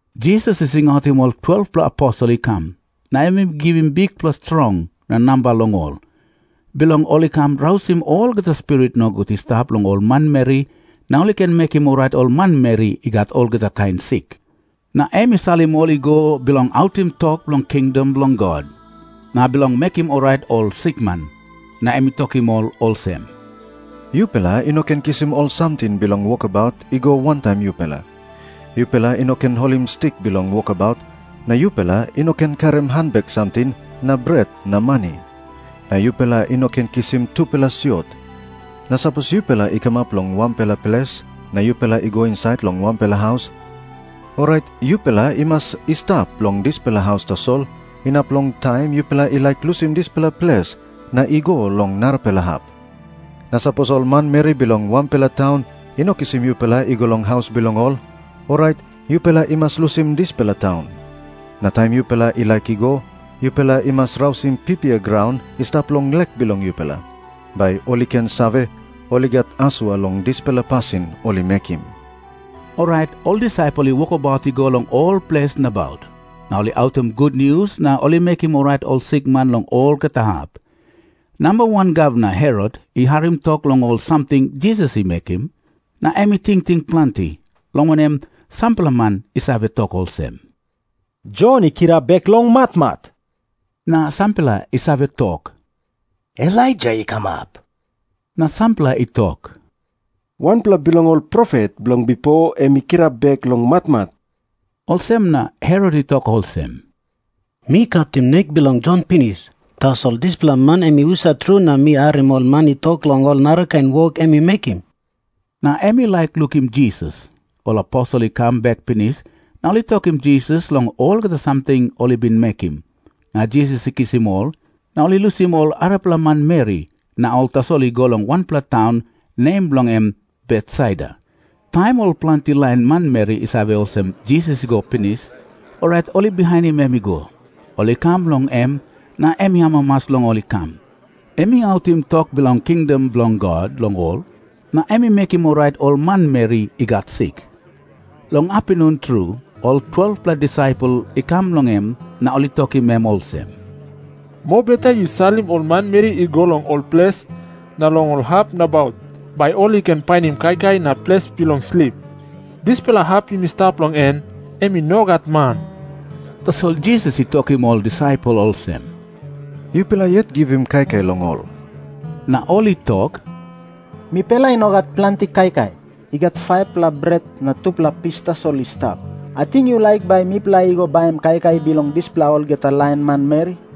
Jisas i singautim ol 12-pela aposel i kam, na em i givim bikpela strong na namba long ol, bilong ol i ken rausim olgeta spirit nogut i stap long ol manmeri na ol i ken mekim orait ol manmeri i gat olgeta kain sik. Na em i salim ol i go bilong autim tok bilong kingdom bilong God, na bilong mekim orait ol sikman. Na em i tokim ol olsem, “Yupela i no ken kisim ol samting bilong wokabaut i go wantaim yupela. Yupela i no ken holim stik bilong wokabaut na yupela i no ken karim hanbek samting na bret na mani. Na yupela i no ken kisim tupela siot. Na sapos yupela i kamap long wanpela ples na yupela i go insait long wanpela haus, orait yupela i mas i stap long dispela haus tasol inap long taim yupela i laik lusim dispela ples na i go long narapela hap. Na sapos ol manmeri bilong wanpela taun i no kisim yupela i go long haus bilong ol, orait yupela i mas lusim dispela taun. Na taim yupela i laik i go, yupela i mas rausim pipia graun i stap long lek bilong yupela, bai ol i ken save, ol i gat asua long dispela pasin ol i mekim.” Orait ol disaipel i wokabaut i go long ol ples nabaut. Na ol i autim gutnius na ol i mekim orait ol sikman long olgeta hap. Namba wan gavman Herot i harim tok long ol samting Jisas i mekim, na em i tingting planti, long wanem, sampela man i save tok olsem, “Jon i kirap bek long matmat.” Na sampela i save tok, “Elaija i kamap.” Na sampela i tok, “Wanpela bilong ol profet bilong bipo em i kirap bek long matmat.” Olsem na Herot i tok olsem, “Mi katim nek bilong Jon pinis. Tasol dispela man em i husat tru na mi harim ol man i tok long ol narakain wok em i mekim?” Na em i laik lukim Jisas. Ol aposel i kam bek pinis, na ol i tokim Jisas long olgeta samting ol i bin mekim. Na Jisas i kisim ol, na ol i lusim ol arapela manmeri, na ol tasol i go long wanpela taun, nem bilong en Betsaida. Taim ol planti lain manmeri i save olsem Jisas i go pinis, orait ol i bihainim em i go. Ol i kam long em, na em i amamas long ol i kam. Em i autim tok bilong kingdom bilong God long ol, na em i mekim orait ol manmeri i gat sik. Long apinun tru ol 12-pela disaipel i kam long em na ol i tokim em olsem, “Mobeta yu salim ol manmeri i go long ol ples na long ol hap nabaut, bai ol i ken painim kaikai na ples bilong slip. Dispela hap yumi stap long en, em i no gat man.” Tasol Jisas i tokim ol disaipel olsem, “Yupela yet givim kaikai long ol.” Na ol i tok, “Mipela i no gat planti kaikai. I gat 5-pela bret na tupela pis tasol i stap. Ating yu laik bai mipela i go baim kaikai bilong dispela olgeta lain manmeri?”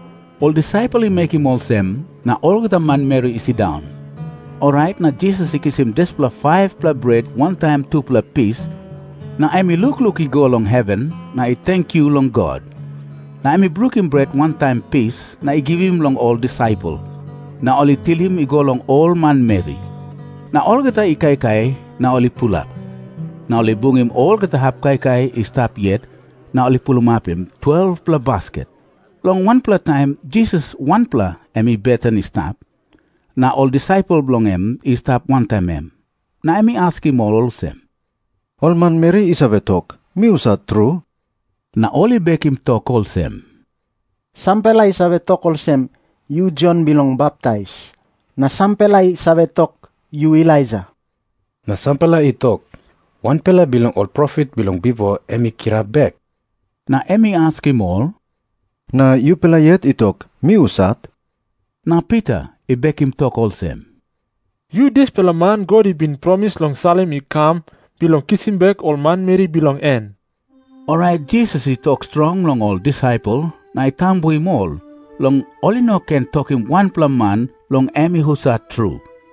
Ol disaipel i mekim olsem, na olgeta manmeri i sindaun. Orait na Jisas i kisim dispela 5-pela bret wantaim tupela pis, na em i lukluk i go long heven na i tenkyu long God. Na em i brukim bret wantaim pis na i givim long ol disaipel, na ol i tilim i go long ol manmeri. Na olgeta i kaikai, na ol i pulap. Na ol i bungim olgeta hap kaikai i stap yet na ol i pulapim 12-pela basket. Long wanpela taim Jisas wanpela em i beten i stap, na ol disaipel bilong en i stap wantaim em. Na em i askim ol olsem, “Ol manmeri i save tok, mi husat tru?” Na ol i bekim tok olsem, “Sampela i save tok olsem, yu Jon Bilong Baptais. Na sampela i save tok, yu Elaija. Na sampela i tok, ‘Wanpela bilong ol profet bilong bipo em i kirap bek.’” Na em i askim ol, “Na yupela yet i tok mi husat?” Na Pita i bekim tok olsem, “Yu dispela man God i bin promis long salim i kam bilong kisim bek ol manmeri bilong en.” Orait Jisas i tok strong long ol disaipel na i tambuim ol long ol i no ken tokim wanpela man long em i husat tru.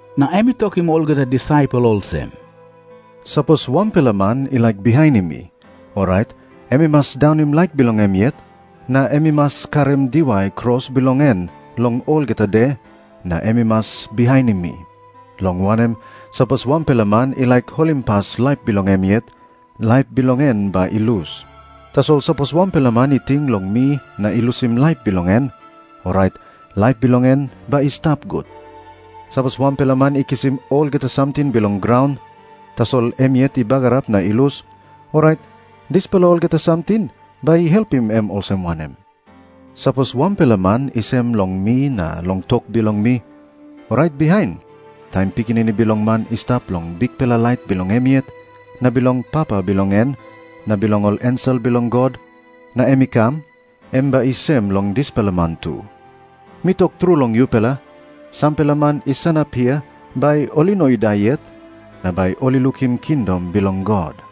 Na em i tokim olgeta manmeri olsem, “Sapos wanpela man i laik bihainim mi, orait em i mas daunim laik bilong em yet, na em i mas karim diwai kros bilong en long olgeta de, na em i mas bihainim mi. Long wanem, sapos wanpela man i laik holimpas laip bilong em yet, laip bilong en bai i lus. Tasol sapos wanpela man i ting long mi na i lusim laip bilong en, orait laip bilong en bai i stap gut. Sapos wanpela man i kisim olgeta samting bilong graun, tasol em yet i bagarap na i lus, orait dispela olgeta samting bai i helpim em olsem wanem? Sapos wanpela man i sem long mi na long tok bilong mi, orait bihain, taim Pikinini Bilong Man i stap long bikpela lait bilong em yet na bilong Papa bilong en na bilong ol ensel bilong God, na em i kam, em bai i sem long dispela man tu. Mi tok tru long yupela, sampela man i sanap hia bai ol i no i dai yet, na bai ol i lukim kingdom bilong God.”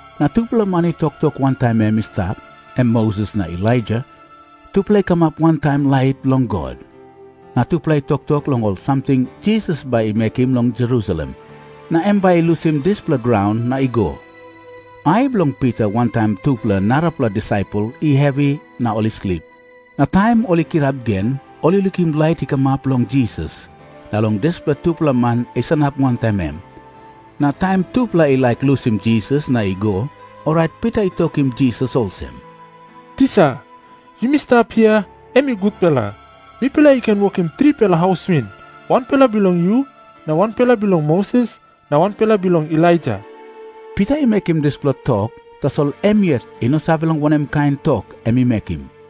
Na tupela man i toktok wantaim em i stap, em Moses na Elaija. Tupela i kamap wantaim lait bilong God, na tupela i toktok long ol samting Jisas bai i mekim long Jerusalem, na em bai i lusim dispela graun na i go. Ai bilong Pita wantaim tupela arapela disaipel i hevi na ol i slip. Na taim ol i kirap gen, ol i lukim lait i kamap long Jisas na long dispela tupela man i sanap wantaim em. Na taim tupela i laik lusim Jisas na i go, orait Pita i tokim Jisas olsem, “Tisa, yumi stap hia, em i gutpela. Mipela i ken wokim tripela haus win, wanpela bilong yu, na wanpela bilong Moses, na wanpela bilong Elaija.” Pita i mekim dispela tok, tasol em yet i no save long wanem kain tok em i mekim.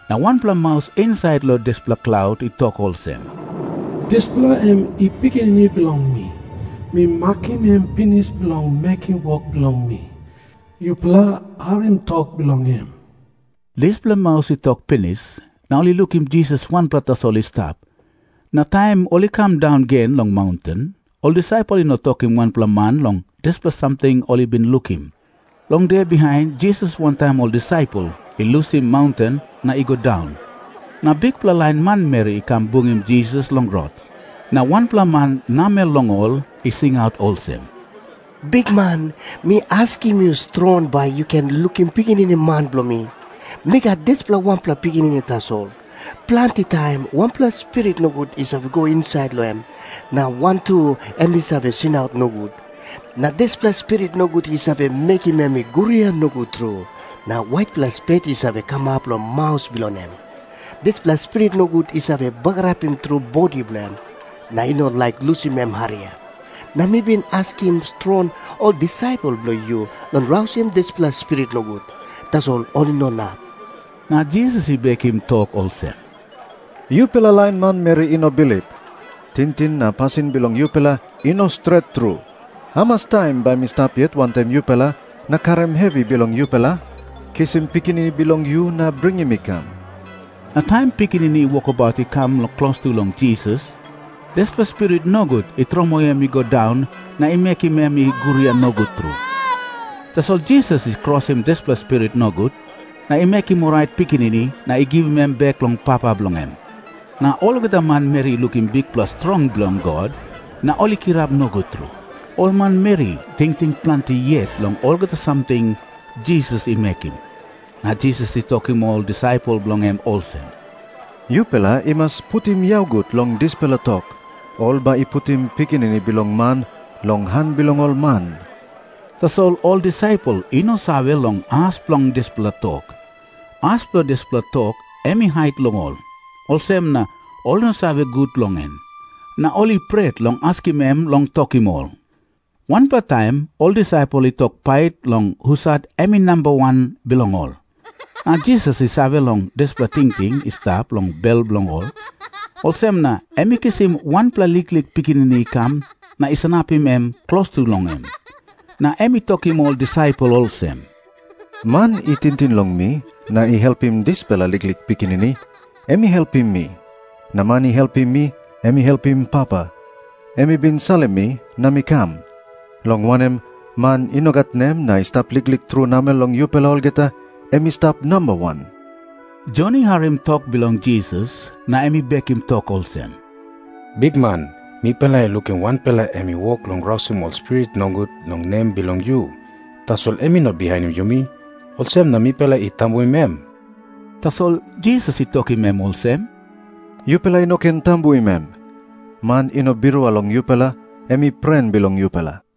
Na wanpela maus insait long dispela klaut i tok olsem, “Dispela em i Pikinini bilong mi. Mi makim em pinis bilong mekim wok bilong mi. Yupela harim tok bilong em.” Dispela maus i tok pinis, na ol i lukim Jisas wanpela tasol i stap. Na taim ol i kam daun gen long maunten, ol disaipel i no tokim wanpela man long dispela samting ol i bin lukim. Long de bihain Jisas wantaim ol disaipel i lusim maunten na i go daun, na bikpela lain manmeri i kam bungim Jisas long rot. Na wanpela man namel long ol i singaut olsem, “Bikman, mi askim yu strong bai yu ken lukim pikinini man bilong mi. Mi gat dispela wanpela pikinini tasol. Planti taim wanpela spirit nogut i save go insait long em, na wantu em i save singaut nogut. Na dispela spirit nogut i save mekim em i guria nogut tru, na waitpela spet i save kamap long maus bilong em. Dispela spirit nogut i save bagarapim tru bodi bilong em, na i no laik lusim em hariap. Na mi bin askim strong ol disaipel bilong yu long rausim dispela spirit nogut. Tasol ol i no inap.” Na Jisas i bekim tok olsem, “Yupela lain manmeri i no bilip, tingting na pasin bilong yupela i no stret tru. Hamas taim bai mi stap yet wantaim yupela na karim hevi bilong yupela? Kisim pikinini bilong yu na bringim i kam.” Na taim pikinini i wokabaut i kam klostu long Jisas, dispela spirit nogut i tromoi em i go daun na i mekim em i guria nogut tru. Tasol Jisas i krosim dispela spirit nogut, na i mekim orait pikinini na i givim em bek long papa bilong en. Na olgeta manmeri i lukim bikpela strong bilong God, na ol i kirap nogut tru. Ol manmeri i tingting planti yet long olgeta samting Jisas i mekim, na Jisas i tokim ol disaipel bilong en olsem, “Yupela i mas putim yau gut long dispela tok. Ol bai i putim Pikinini Bilong Man long han bilong ol man.” Tasol ol disaipel i no save long as bilong dispela tok. As bilong dispela tok em i hait long ol, olsem na ol i no save gut long en. Na ol i pret long askim em long tokim ol. Wanpela taim ol disaipel i tok pait long husat em i namba wan bilong ol. Na Jisas i save long dispela tingting i stap long bel bilong ol. Olsem na em i kisim wanpela liklik pikinini i kam na i sanapim em klostu long em. Na em i tokim ol disaipel olsem, “Man i tingting long mi na i helpim dispela liklik pikinini, em i helpim mi. Na man i helpim mi, em i helpim Papa, em i bin salim mi na mi kam. Long wanem, man i no gat nem na i stap liklik tru namel long yupela olgeta, em i stap namba wan.” Jon i harim tok bilong Jisas na em i bekim tok olsem, “Bikman, mipela i lukim wanpela em i wok long rausim ol spirit nogut long nem bilong yu. Tasol em i no bihainim yumi. Olsem na mipela i tambuim em.” Tasol Jisas i tokim em olsem, “Yupela i no ken tambuim em. Man i no birua long yupela, em i pren bilong yupela.”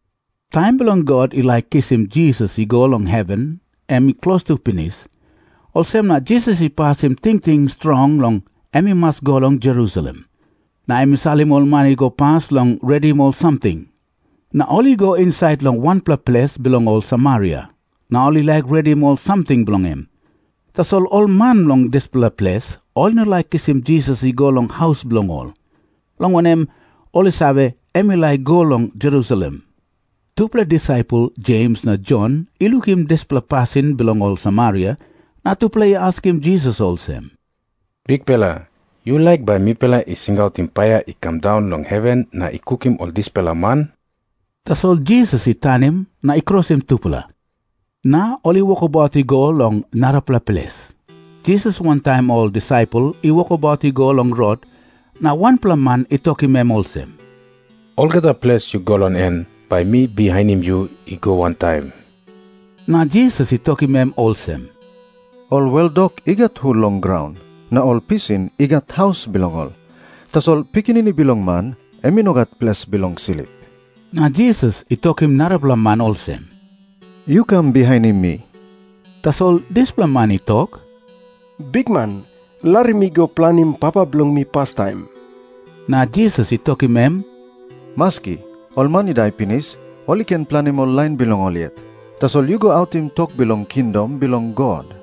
Taim bilong God i laik kisim Jisas i go long heven em i klostu pinis. Olsem na Jisas i pasim tingting strong long em i mas i go long Jerusalem. Na em i salim ol man i go pas bilong redim ol samting, na ol i go insait long wanpela ples bilong ol Samaria, na ol i laik redim ol samting bilong em. Tasol ol man bilong dispela ples i no laik kisim Jisas i go long haus bilong ol, long wanem, ol i save, em i laik i go long Jerusalem. Tupela disaipel, Jems na Jon, i lukim dispela pasin bilong ol Samaria, na tupela i askim Jisas olsem, “Bikpela, yu laik bai mipela i singautim paia i kam daun long heven na i kukim ol dispela man?” Tasol Jisas i tanim na i krosim tupela. Na ol i wokabaut i go long narapela ples. Jisas wantaim ol disaipel i wokabaut i go long rot, na wanpela man i tokim em olsem, “Olgeta ples yu go long en, bai mi bihainim yu i go wantaim.” Na Jisas i tokim em olsem, “Ol weldok i gat hul long graun, na ol pisin i gat haus bilong ol. Tasol Pikinini Bilong Man em i no gat ples bilong slip.” Na Jisas i tokim narapela man olsem, “Yu kam bihainim mi.” Tasol dispela man i tok, “Bikman, larim mi i go planim papa bilong mi pastaim.” Na Jisas i tokim em, “Maski. Ol man i dai pinis, ol i ken planim ol lain bilong ol yet. Tasol yu go autim tok bilong kingdom bilong God.”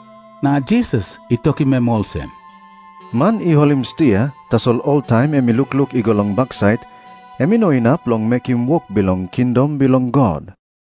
Na Jisas i tokim em olsem, “Man i holim stia, tasol oltaim em i lukluk i go long baksait, em i no inap long mekim wok bilong kingdom bilong God.”